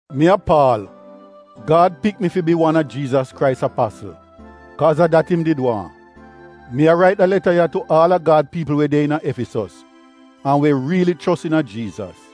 Mi a Paal. Gad pik mi fi bi wan a Jiizas Krais apasl, kaaz a dat im did waahn. Mi a rait da leta ya tu aal a Gad piipl we de iina Efisos an we riili chos iina Jiizas.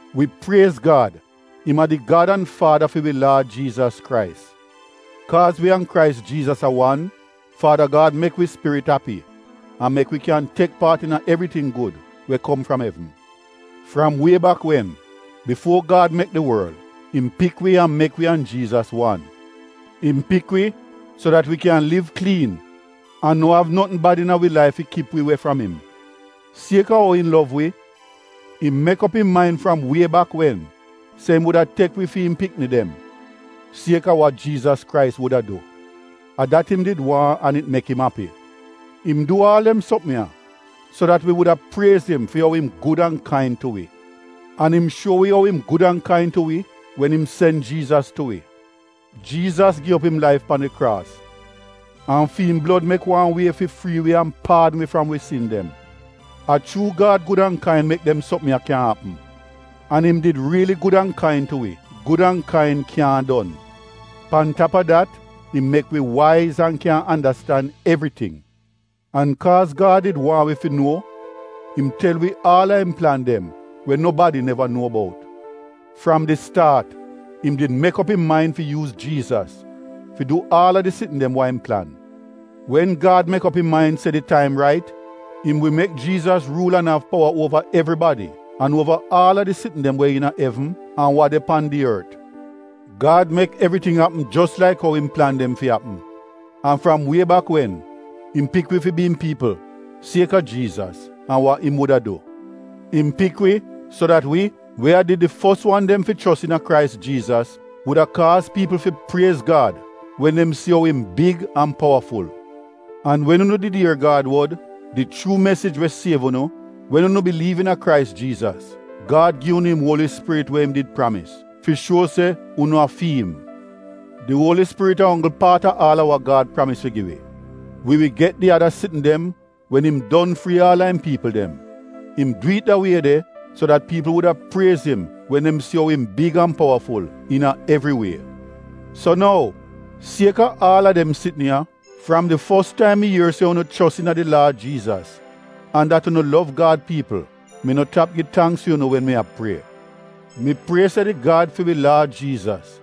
Wi priez Gad. Im a di Gad an Faada fi wi Laad Jiizas Krais. Kaaz wi an Krais Jiizas a wan, Faada Gad mek wi spirit api an mek wi kyan tek paat iina evriting gud we kom fram evn. Fram wie bak wen, bifuo Gad mek di worl, im pik wi an mek wi an Jiizas wan. Im pik wi, so dat wi kyan liv kliin an no av notn bad iina wi laif fi kip wi we fram im. Sieka ou im lov wi, im mek op im main fram wie bak wen se im wuda tek wi fi im pikni dem, sieka wa Jiizas Krais wuda du. A dat im did waahn an it mek im api. Im du aal dem sopm ya so dat wi wuda priez im fi ou im gud an kain tu wi. An im shuo wi ou im gud an kain tu wi wen im sen Jiizas tu wi. Jiizas gi op im laif pan di kraas an fi im blod mek wan wie fi frii wi an paadn wi fram wi sin dem. A chuu Gad gud an kain mek dem sopm ya kyan apm. An im did riili gud an kain tu wi — gud an kain kyaahn don. Pan tap a dat, im mek wi waiz an kyan andastan evriting. An kaaz Gad did waahn wi fi nuo, im tel wi aal a im plan dem we nobadi neva nuo bout. Fram di staat, im did mek op im main fi yuuz Jiizas fi du aal a di sitn dem wa im plan. Wen Gad mek op im main se di taim rait, im wi mek Jiizas ruul an av powa uova evribadi an uova aal a di sitn dem we iina evn an wa de pan di ort. Gad mek evriting apm jos laik ou im plan dem fi apm, an fram wie bak wen, im pik wi fi bi im piipl sieka Jiizas an wa im wuda du. Im pik wi, so dat wi, we a did di fos wan dem fi chos iina Krais Jiizas, wuda kaaz piipl fi priez Gad, wen dem si ou im big an powaful. An wen unu did ier Gad wod — di chuu mesij we siev unu — wen unu biliiv iina Krais Jiizas, Gad gi unu im Uoli Spirit we im did pramis, fi shuo se unu a fi im. Di Uoli Spirit a onggl paat a aal a wa Gad pramis fi gi wi. Wi wi get di ada sitn dem wen im don frii aal a im piipl dem. Im du it da wie de so dat piipl wuda priez im wen dem si ou im big an powaful iina evri wie. So nou, sieka aal a dem sitn ya, fram di fos taim mi ier se unu chos iina di Laad Jiizas an dat unu lov Gad piipl, mi no tap gi tangks fi unu wen mi a prie. Mi prie se di Gad fi wi Laad Jiizas,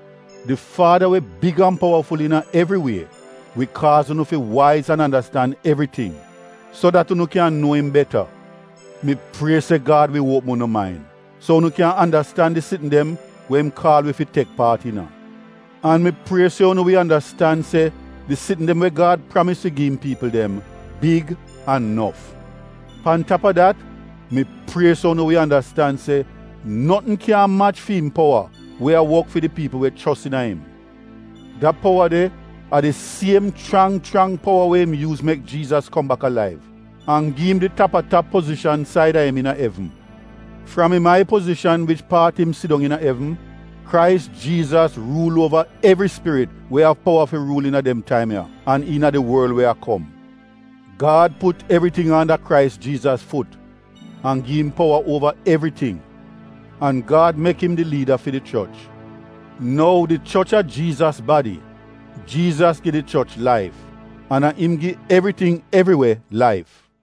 di Faada we big an powaful iina evri wie, wi kaaz unu fi waiz an andastan evriting, so dat unu kyan nuo im beta. Mi prie se Gad wi uopm unu main, so unu kyan andastan di sitn dem we im kaal wi fi tek paat iina. An mi prie se unu wi andastan se di sitn dem we Gad pramis fi gi im piipl dem big an nof. Pan tap a dat, mi prie se unu wi andastan se notn kyaahn mach fi im powa we a wok fi di piipl we chos iina im. Da powa de a di siem chrang chrang powa we im yuuz mek Jiizas kom bak alaiv an gi im di tap-a-tap pozishan saida im iina evn. Fram im ai pozishan wich paat im sidong iina evn, Krais Jiizas ruul uova evri spirit we av powa fi ruul iina dem taim ya an iina di worl we a kom. Gad put evriting anda Krais Jiizas fut an gi im powa uova evriting. An Gad mek im di liida fi di choch. Nou, di choch a Jiizas badi. Jiizas gi di choch laif, an a im gi evriting evriwe laif.